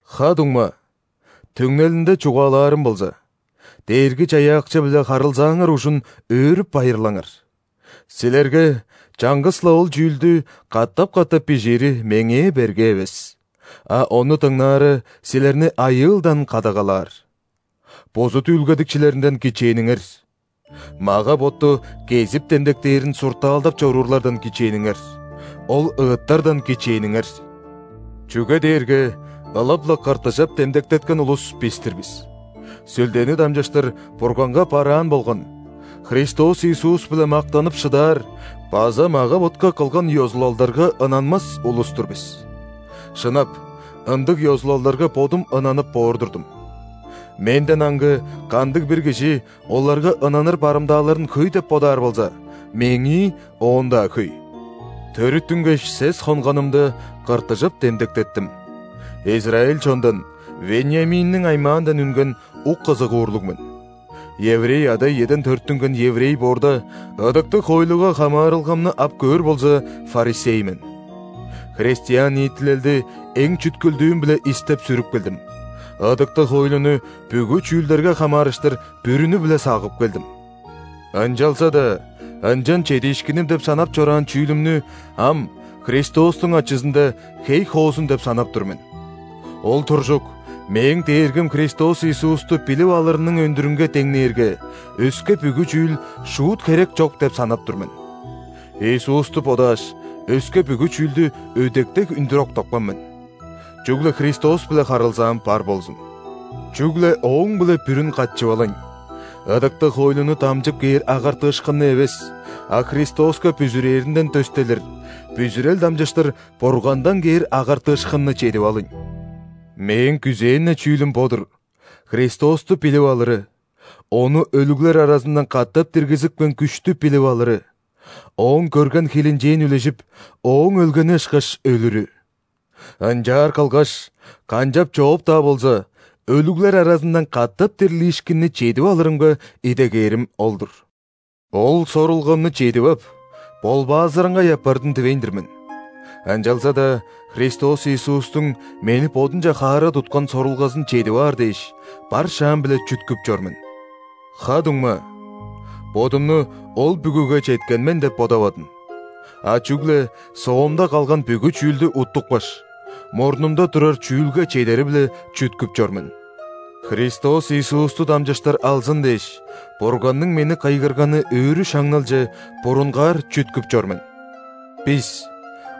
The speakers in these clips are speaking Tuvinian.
Ха-дуңма, түңнелинде чугаалаарым болза, Дээрги-Чаяакчы-биле харылзааңар ужун өөрүп-байырлаңар! Силерге чаңгыс-ла ол чүүлдү катап-катап бижиири меңээ берге эвес, а ону дыңнаары силерни айыылдан кадагалаар. Бузут үүлгедикчилеринден кичээниңер! Мага-ботту кезип демдектээрин суртаалдап чоруурлардан кичээниңер! Ол ыттардан кичээниңер! Чүге дээрге ылап-ла ·кыртыжап демдектеткен улус – бис-тир бис, Сүлдени дамчыштыр Бурганга бараан болган, Христос Иисус-биле мактанып шыдаар база мага-ботка кылган ёзулалдарга ынанмас улус-тур бис. Шынап, ындыг ёзулалдарга бодум ынанып боор турдум. Менден аңгы кандыг-бир кижи оларга ынаныр барымдааларын хөй деп бодаар болза, мээңии оон-даа хөй. Төрүттүнгеш, сес хонганымда, кыртыжап демдектеттим, израиль чондан, Вениаминниң аймаандан үнген ук-ызыгуурлуг мен. Еврей ада-иеден төрүттүнген еврей боорда, ыдыктыг хоойлуга хамаарылгамны ап көөр болза, ·фарисей мен. Христиан ниитилелди эң чүткүлдүүм-биле истеп-сүрүп келдим, ыдыктыг хоойлуну бүгү чүүлдерге хамаарыштыр бүрүнү-биле сагып келдим. Ынчалза-даа ынчан чедиишкиним деп санап чораан чүүлүмнү ам Христостуң ачызында хей хоозун деп санап тур мен. Ол туржук, мээң Дээргим Христос Иисусту билип алырының өндүрүнге деңнээрге, өске бүгү чүүл шуут херек чок деп санап тур мен. Иисусту бодааш, өске бүгү чүүлдү өдек дег үндүр октапкан мен. Чүгле Христос-биле харылзаам бар болзун, чүгле Ооң-биле бүрүн катчып алыйн! Ыдыктыг хоойлуну дамчып кээр агартыышкынны эвес, а Христоска бүзүрээринден дөстелир, бүзүрел дамчыштыр Бургандан кээр агартыышкынны чедип алыйн! Мээң күзээн-не чүүлүм бо-дур: Христосту билип алыры, Ону өлүглер аразындан катап диргизипкен күштү билип алыры, Ооң көрген хилинчээн үлежип, Ооң өлгени ышкаш өлүрү. Ынчаар кылгаш, канчап-чооп-даа болза өлүглер аразындан катап дирлиишкинни чедип алырымга идегээрим ол-дур. Ол сорулгамны чедип ап, ·болбаазыраңгай апардым дивейн-дир мен, ынчалза-даа Христос Иисустуң мени Бодунче хаара туткан сорулгазын чедип аар дээш, бар шаам-биле чүткүп чор мен. Ха-дуңма, бодумну ол бүгүге четкен мен деп бодавадым, а чүгле соомда калган бүгү чүүлдү уттупкаш, мурнумда турар чүүлге чедери-биле чүткүп чор мен. Христос Иисусту дамчыштыр алзын дээш, Бурганның мени кыйгырганы өрү шаңналче – бурунгаар чүткүп чор мен. Бис,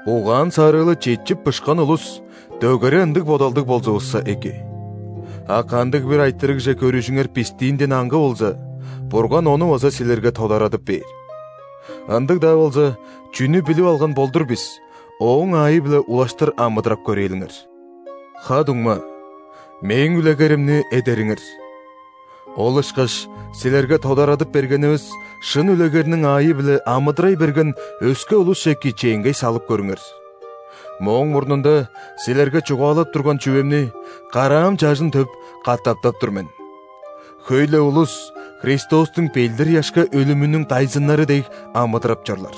угаан-сарыылы четчип, бышкан улус, дөгере ындыг бодалдыг болзувусса эки. А кандыг-бир айтырыгже көрүжүңер бистиинден аңгы болза, Бурган ону база силерге тодарадып бээр. Ындыг-даа болза, чүнү билип алган болдур бис, ооң аайы-биле улаштыр амыдырап көрээлиңер. Ха-дуңма, мээң үлегеримни эдериңер. Ол ышкаш силерге тодарадып бергенивис шын үлегерниң аайы-биле амыдырай берген өске улусче кичээнгей салып көрүңер. Мооң мурнунда силерге чугаалап турган чүвемни, караам чажын төп, катаптап тур мен: хөй-ле улус Христостуң ·белдир-ыяшка өлүмүнүң дайзыннары дег амыдырап чорлар.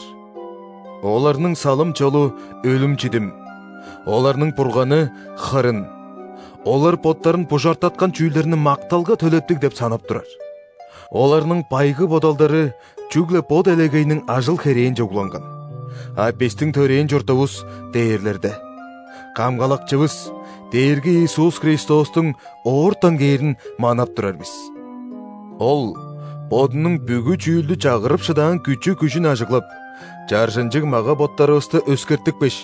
Оларның салым-чолу – өлүм-чидим, оларның бурганы – хырын, олар боттарын бужартаткан чүүлдерни макталга төлептиг деп санап турар. Оларның байгы бодалдары чүгле бо делегейниң ажыл-херээнче угланган. А бистиң төрээн чуртувус – дээрлерде. Камгалакчывыс, Дээрги Иисус Христостуң оортан кээрин манап турар бис. Ол Бодунуң бүгү чүүлдү чагырып шыдаан күчү-күжүн ажыглап, чаржынчыг мага-боттарывысты өскертипкеш,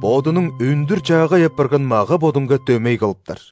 Бодунуң өндүр-чаагай апарган мага-бодунга дөмей кылыптар.